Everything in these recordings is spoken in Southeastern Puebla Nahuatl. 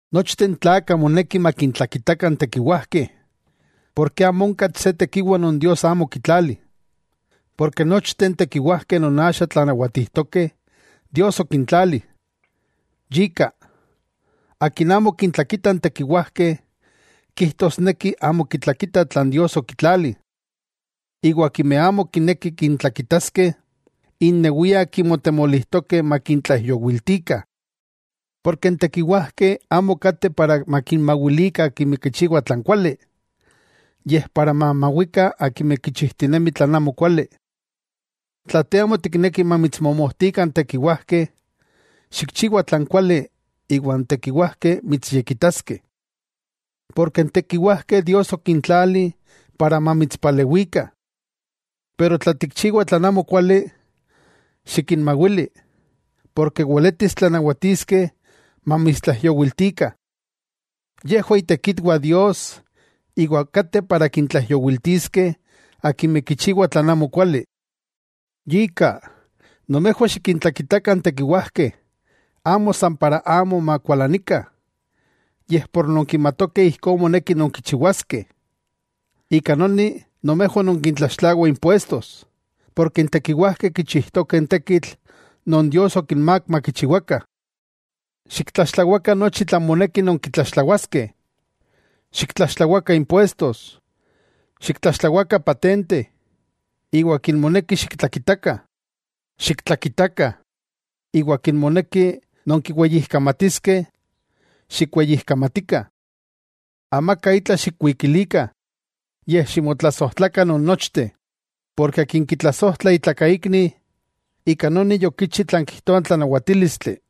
Nochteh n tlakah moneki makintlakitakah n tekiwajkeh. Porke amo onka se tekiwa non Dios amo okitlali, porke nochteh n tekiwajkeh non axa tlanawatijtokeh, Dios okintlali. Yika, akin amo kintlakita n tekiwajkeh, kijtosneki amo kitlakita tlan Dios okitlali. Iwa akimeh amo kinekih kintlakitaskeh, innewiah kimotemolijtokeh makintlaijyowiltikah. Porke n tekiwajkeh amo kateh para makinmawilikah akimeh kichiwah tlan kuali, yej para mamawikah akimeh kichijtinemih tlan amokuali. Tla te amo tikneki mamitsmomojtikah n tekiwajkeh; xikchiwa tlan kuali iwa n tekiwajkeh mitsyekitaskeh. Porke n tekiwajkeh Dios okintlali para mamitspalewikah. Pero tla tikchiwa tlan amokuali, xikinmawili, porke weletis tlanawatiskeh mamitstlaijyowiltikah. Yejwah itekitwah Dios iwa kateh para kintlaijyowiltiskeh akimeh kichiwah tlan amokuali. Yika, nomejwah xikintlakitakah n tekiwajkeh amo san para amo makualanikah, yej por nonkimatokeh ijkó moneki nonkichiwaskeh. Ika noni nomejwah nonkitlaxtlawah impuestos; porke n tekiwajkeh kichijtokeh n tekitl non Dios okinmák makichiwakah. Xiktlaxtlawakah nochi tlan moneki nonkitlaxtlawaskeh. Xiktlaxtlawakah impuestos, xiktlaxtlawakah patente, iwa akin moneki xiktlakitakah, xiktlakitakah, iwa akin moneki nonkiweyijkamatiskeh, xikweyijkamatikah. Amaka itla xikwikilikah, yej ximotlasojtlakah non nochteh; porke akin kitlasojtla itlakaikni, ika noni yokichi tlan kijtoa n tlanawatílistli.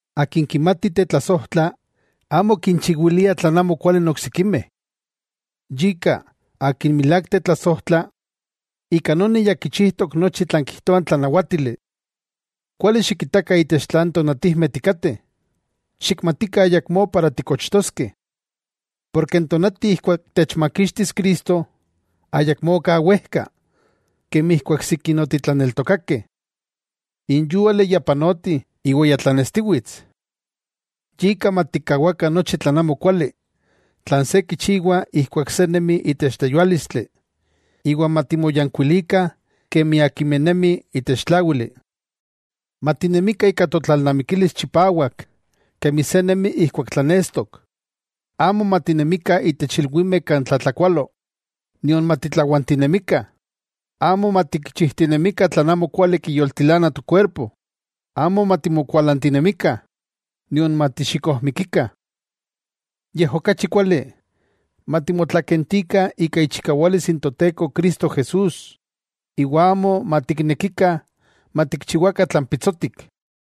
Akin kimati tetlasojtla, amo kinchiwilia tlan amokuali n oksikimeh. Yika akin milák tetlasojtla, ika noni ya kichijtok nochi tlan kijtoa n tlanawátili. Kuali xikitakah itech tlan tonatijmeh tikateh, xikmatikah ayakmó para tikochtoskeh. Porke n tonati ijkuak techmakixtis Cristo ayakmó ka wejka, kemi ijkuak sikin otitlaneltokakeh. N yúali ya panoti iwa ya tlanestiwits; yika matikkawakah nochi tlan amokuali, tlan se kichiwa ijkuak se nemi itech tleyuálistli iwa matimoyankuilikah kemi akimeh nemih itech tláwili. Matinemikah ika totlalnamikilis chipawak kemi se nemi ijkuak tlanestok. Amo matinemikah itech ilwimeh kan tlatlakualo, nion matitlawantinemikah, amo matikchijtinemikah tlan amokuali kiyoltilana tokuerpo, amo matimokualantinemikah nion matixikojmikikah. Yej okachi kuali, matimotlakentikah ika ichikawalis n Toteko Cristo Jesús, iwa amo matiknekikah matikchiwakah tlan pitsotik.